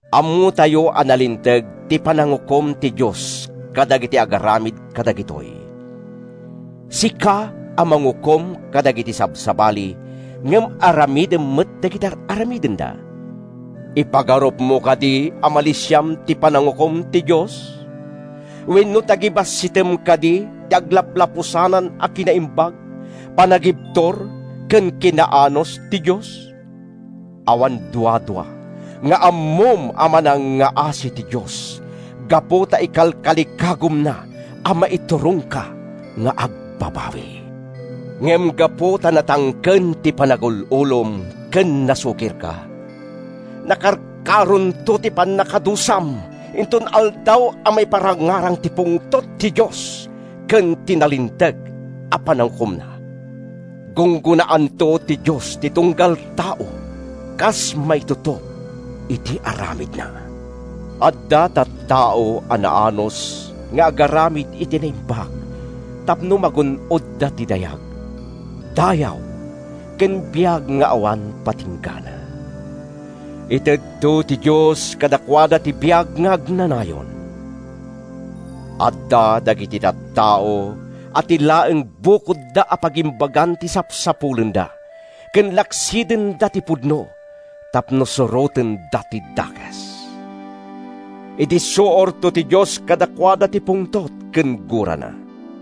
Ammotayo a nalinteg ti panangukom ti Dios kadagiti agaramid kadagitoy. Sika a mangukom kadagiti sabsabali ngem aramidem met dagiti ar-aramidenda, ipagarupmo kadi a malisiam ti panangukom ti Dios? Wenno, tagibassitem kadi ti aglaplapusanan a kinaimbag, panagibtur ken kinaanus ti Dios? Awan duadua nga ammom a manangngaasi ti Dios gapu ta ikalkalikagumna a maiturongka nga agbabawi. Ngem gapu ta natangken ti panagul-ulom ken nasukirka, nakarkaronto ti pannakadusam inton Aldaw a maiparangarang ti pungtot ti Dios ken ti nalinteg a panangukomna. Gunggonaanto ti Dios ti tunggal tao kas maitutop iti aramidna. Adda tattao a naanus nga agaramid iti naimbag tapno magun-odda ti dayag, dayaw ken biag nga awan patinggana. Itedto ti Dios kadakuada ti biag nga agnanayon. Adda dagiti tattao a ti laeng bukodda a pagimbagan ti sapsapulenda ken laksidenda ti pudno tapno surotenda ti dakes. Idissuorto ti Dios kadakuada ti pungtot ken gurana.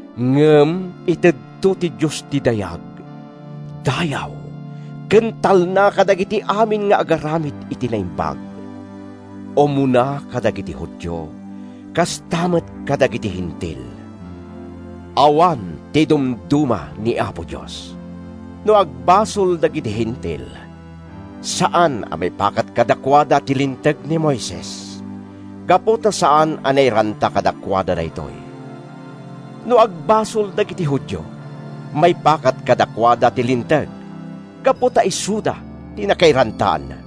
Ngem itedto ti Dios ti dayag, dayaw ken talna kadagiti amin nga agaramid iti naimbag, umuna kadagiti Judio kasta met kadagiti Hentil. Awan ti idumduma ni Apo Dios. No agbasol dagiti Hentil, saan a maipakat kadakuada ti Linteg ni Moises gapu ta saan a nairanta kadakuada daytoy. No agbasol dagiti Judio, maipakat kadakuada ti Linteg gapu ta isuda ti nakairantaanna.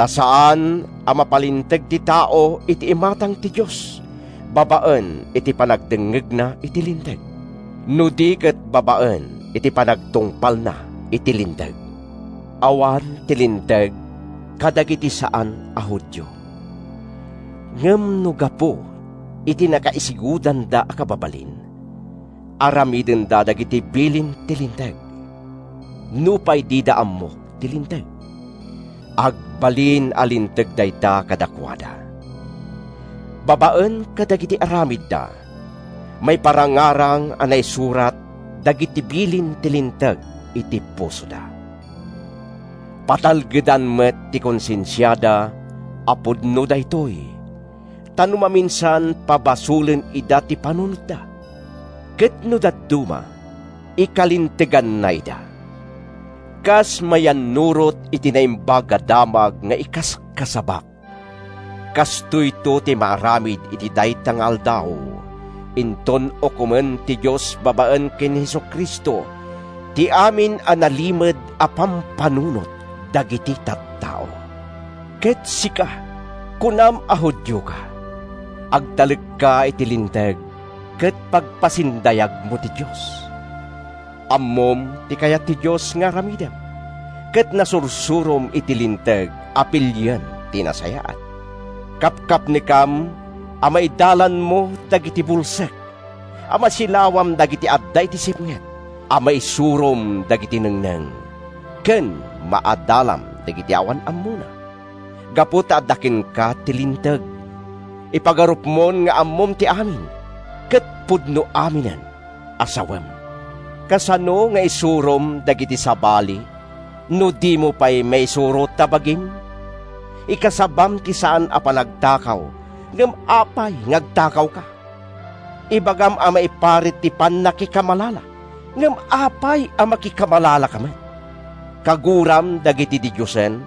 Ta saan a mapalinteg ti tao iti imatang ti Dios babaen iti panagdengngegna iti Linteg, no di ket babaen iti panagtungpalna iti Linteg. Awan ti Linteg kadagiti saan a Judio. Ngem no gapu iti nakaisigudanda a kababalin, aramidenda dagiti ibilin ti Linteg nupay dida ammo ti Linteg, agbalin a linteg dayta kadakuada. Babaen kadagiti aramidda, maiparangarang a naisurat dagiti bilin ti Linteg iti pusoda. Patalgedan met ti konsensiada a pudno daytoy, ta no maminsan pabasolen ida ti panunotda, ket no dadduma, ikalinteganna ida. Kas mayannurot iti Naimbag a Damag nga ikaskasabak, kastoyto ti maaramid iti dayta nga Aldaw inton ukomen ti Dios babaen ken ni Jesu-Cristo, ti amin a nalimed a pampanunot dagiti tattao. Ket sika? Kunam a Judioka. Agtalekka iti Linteg ket pagpasindayagmo ti Dios. Ammom ti kayat ti Dios nga aramidem, ket nasursurom iti Linteg a pilien ti nasayaat. Kapkapnekam a maidalanmo dagiti bulsek, a masilawam dagiti adda iti sipnget, a maisurom dagiti nengneng, ken maadalam dagiti awan ammona. Gapu ta adda kenka ti Linteg, ipagarupmon nga ammom ti amin ket pudno aminen a sawem. Kasano nga isurom dagiti sabali no dimo pay maisuro ta bagim? Ikasabam ti saan a panagtakaw, ngem apay nga agtakawka? Ibagam a maiparit ti pannakikamalala, ngem apay a makikamalalaka met? Kaguram dagiti didiosen,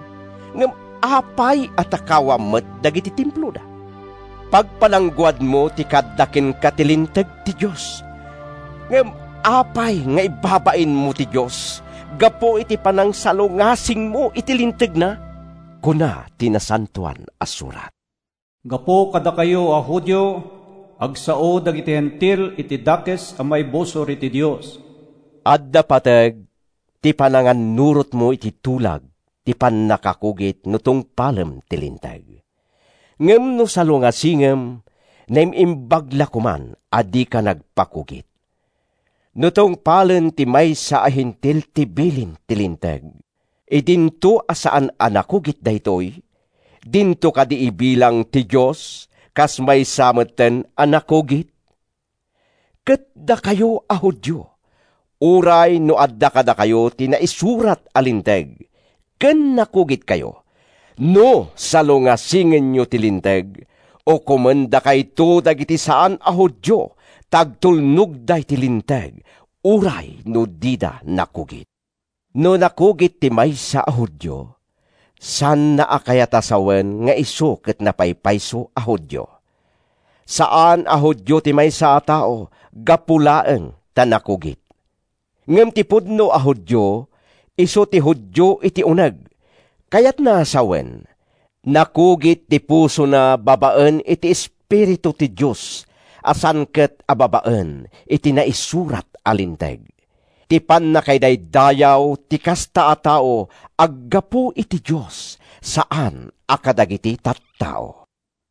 ngem apay a takawam met dagiti temploda! Pagpalangguadmo ti kaadda kenka ti linteg ti Dios, ngem apay nga ibabainmo ti Dios gapu iti panangsalungasingmo iti lintegna? Kuna ti Nasantoan a Surat, “Gapu kadakayo a Judio, agsao dagiti Hentil iti dakes a maibusor iti Dios.” Adda pateg ti panangannurotmo iti tulag ti pannakakugit no tungpalem ti Linteg. Ngem no salungasingem, naim-imbag la koman a dika nagpakugit. No tungpalen ti maysa a Hentil ti bilin ti Linteg idinto a saan a nakugit daytoy, dinto kadi ibilang ti Dios a kas maysa metten a nakugit? Ket dakayo a Judio, uray no adda kadakayo ti naisurat a Linteg, ken nakugitkayo, no salungasingenyo ti Linteg, ukomendakayto dagiti saan a Judio ta agtulnogda iti Linteg uray no dida nakugit. No nakugit ti maysa a Judio, saanna kayat a sawen nga isu ket napaypayso a Judio. Saan a Judio ti maysa a tao gapu laeng ta nakugit. Ngem ti pudno a Judio, isu ti Judio iti uneg, kayatna a sawen, nakugit ti pusona babaen iti Espiritu ti Dios a saan ket a babaen iti naisurat a Linteg. Ti pannakaidaydayaw ti kasta a tao aggapu iti Dios, saan a kadagiti tattao.